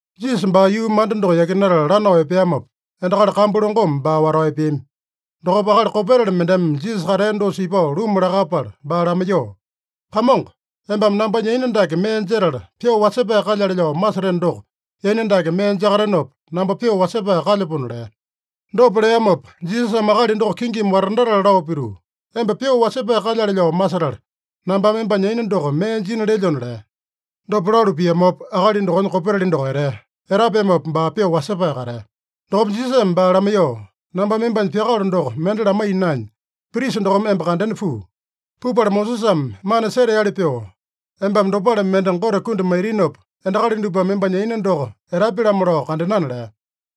Jisasa baa yuu manda doko yakinatala lanao epeamopa, endakali kambu longome baa watao epeami. Dokopa akali kopetali mendeme Jisasa katea dosa ipao luma lakapala baa lamaiyoo, “Kamongo, embame nambanya yaina dake mee jetala, pyoo wasepae kalyale lao maseteno doko, yaina dake mee jakatenopa, namba pyoo wasepae kalyapona” lea. Dopa leamopa, Jisasame akali doko kingimi watandatala lao pituu, “Emba pyoo wasepae kalyale lao masetala, nambame embanya yaina doko mee jina lelyona” lea. Dopa lalu piamopa, akali dokonya kopetali doko etea. Etapeamopa baa pyoo wasepae katea. Dokopa Jisasame baa lamaiyoo, “Nambame embanya pyakalo doko mende lamaiya naenya, prisa dokome emba kandena puu. Pupala Mosesame mana seteali pyoo embame dopale mende Gote kundi maitinopa, endakali dupame embanya yaina doko etapya-lamo lao kandenana” lea.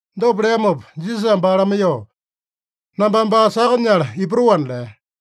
Dopa leamopa Jisasame baa lamaiyoo, “Nambame baa saka nyala ipatoana” lea.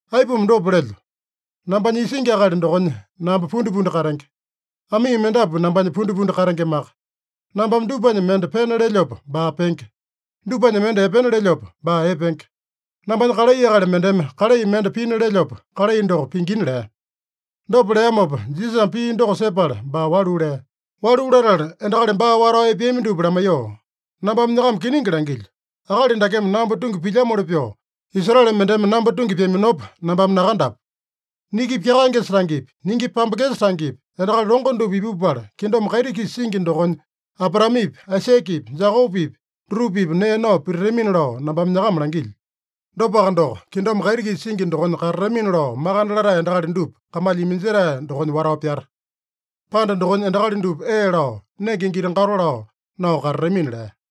Aipuma dopa lelyo? Nambanya isingi akali dokonya namba pundipundi katenge. Amii mendapu nambanya pundipundi katengemaka. Nambame dupanya mende pena lelyopa, baa penge. Dupanya mende epena lelyopa, baa epenge. Nambanya kalai akali mendeme kalai mende pina lelyopa, kalai doko pingina” lea. Dopa leamopa, Jisasame pii doko sepala baa walu lea. Walu latala endakali baa watao epeami dupa lamaiyoo, “Nambame nyakama kiningi langilyo: Akali dakeme namba tungi pilyamoli pyoo, Israele mendeme namba tungi pyaminopa nambame nakandapu. Niki pyakaengesa tangepi, niki pambengesa tangepi, endakali longo dupa ipupala kingdom kaiti-kisa singi dokonya, Abraamepi, Aisakepi, Jekopepi dutupa-pipa nee nao pititamina lao nambame nyakama langilyo. Dopaka doko, kingdom kaiti-kisa singi dokonya katatamina lao makande latae endakali dupa kamalya iminjetae dokonya watao pyata. Panda dokonya endakali dupa ee lao, nenge giti-gato lao nao katatamina” lea.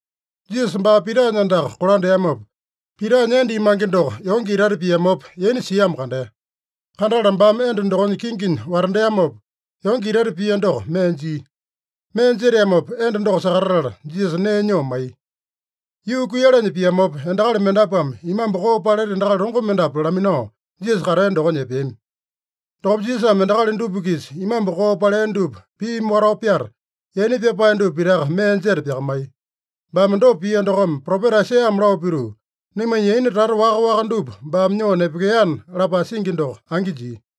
Jisasa baa Pitanya andaka kolandeamopa, Pitanya enda imange doko yonge itaita piamopa yaina siamo kandea. Kandatala baame enda dokonya kinginya watandeamopa, yonge itaita pia doko mee jia. Mee jeteamopa enda doko sakatatala, Jisasa nee nyoo maiya. Yuu kuiyalanya piamopa, endakali mendapuame imambu koo paleta endakali longo mendapu laminao, Jisasa katea dokonya epeami. Dokopa Jisasame endakali dupa-kisa imambu koo palea dupa piimi watao pyata, yaina pyapae dupa pitaka mee jeta pyakamaiya. Baame dopa pia dokome, propeta Aisaiyame lao pituu, “Naimanya yaina tata waka-waka dupa baame nyoo nepekeana” lapae singi doko angi jia.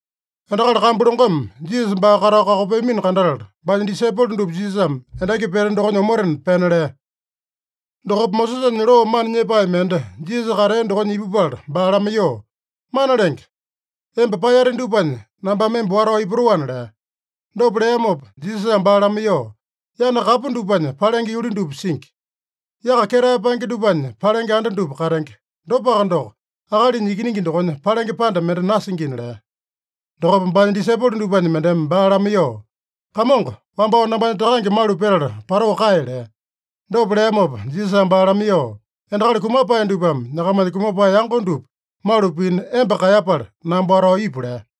Endakali kambu longome Jisasa baa katao kakopeamino kandatala, baanya disaipolo dupa Jisasame endaki pete dokonya omotena pena lea. Dokopa Mosesanya loo mana nyepae mende Jisasa katea dokonya ipupala baa lamaiyoo, “Mana Lenge, emba paeyate dupanya nambame emba watao ipatoana” lea. Dopa leamopa Jisasame baa lamaiyoo, “Yana kapu dupanya palenge yuli dupa singi. Yaka ketae paenge dupanya palenge anda dupa katenge. Dopaka doko, Akalinya Ikiningi dokonya palenge panda mende nasingina” lea. Dokopa baanya disaipolo dupanya mendeme baa lamaiyoo, “Kamongo, wambao nambanya takange malu petala patoo kae” lea. Dopa leamopa Jisasame baa lamaiyoo, “Endakali kumapae dupame nyakamanya kumapae yango dupa malu pina emba kaeyapala, namba watao ipu” lea.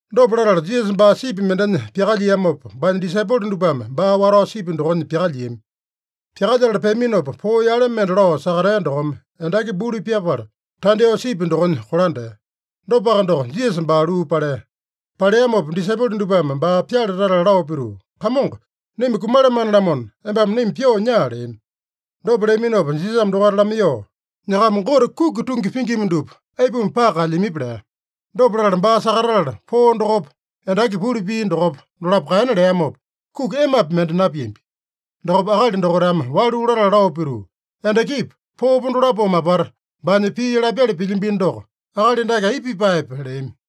Dopa latala Jisasa baa sipi mendenya pyakalyiamopa, baanya disaipolo dupame baa watao sipi dokonya pyakalyiami. Pyakalyetala peaminopa, poo yale mende lao sakatea dokome, endaki buli pyapala, tandyoo sipi dokonya kolandea. Dopaka doko, Jisasa baa luu palea. Paleamopa disaipolo dupame baa pyale tatala lao pituu, “Kamongo, naima kumalamane-lamona, embame naima pyoo nyaa” leami. Dopa leaminopa Jisasame dokaita lamaiyoo, “Nyakama Gote kuki tungi pingima dupa, aipuma paka kaelyamipi?” lea. Dopa latala baa sakatatala, poo dokopa, endaki buli pia dokopa, dolapo kaena leamopa, kuki emapi mende napiambi. Dokopa akali dokaitame walu latala lao pituu, “Endakipa, poopa dolapome apata baanya pii lapyali pilyambino doko, akali dake aipa pipaepe?” leami.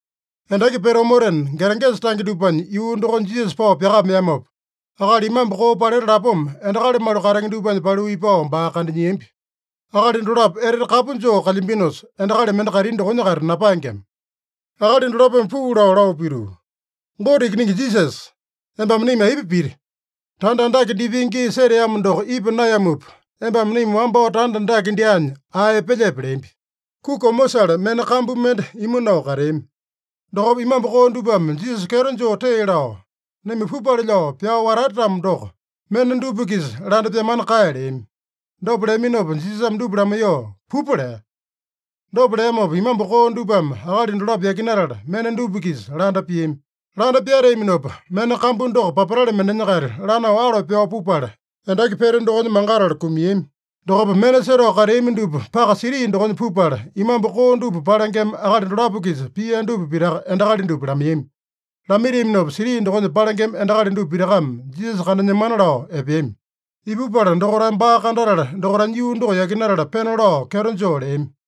Endaki pete omotena, Geregesa tange dupanya yuu dokonya Jisasa pao pyakameamopa, akali imambu koo paleta lapoma endakali malu katenge dupanya paliu ipao baa kandanyiambi. Akali dolapo etete kapu joo kalyambinosa, endakali mende kaitini dokonya-kaita napaengema. Akali dolapome puu lao, lao pituu, “Gote Ikiningi Jisasa, embame naima aipa piti? Tanda andake dipenge gii seteamo doko ipa naeyamupa, embame naima wambao tanda andake dyaanya ae epelyepe?” leambi. Kuki omosale mena kambu mende imu nao kateami. Dokopa imambu koo dupame Jisasa kyeto joo tee lao, “Naima pupale lao pyao watate-tamo doko, mena dupa-kisa landa pyamana kae” leami. Dopa leaminopa Jisasame dupa lamaiyoo, “Pupa” lea. Dopa leamopa, imambu koo dupame akali dolapo yakinatala, mena dupa-kisa landa piami. Landa pyateaminopa, mena kambu doko papatale mendenya-kaita lanao alo pyao pupala, endaki pete dokonya mangatala kumiami. Dokopa mena setao kateami dupa paka siti dokonya pupala, imambu koo dupa palengema akali dolapo-kisa pia dupa pitaka endakali dupa lamaiyami. Lamaitiaminopa, siti dokonya palengema endakali dupa pitakame Jisasa kandanyemana lao epeami. Ipupala dokaitame baa kandatala, dokaitanya yuu doko yakinatala pena lao kyeto joo leami.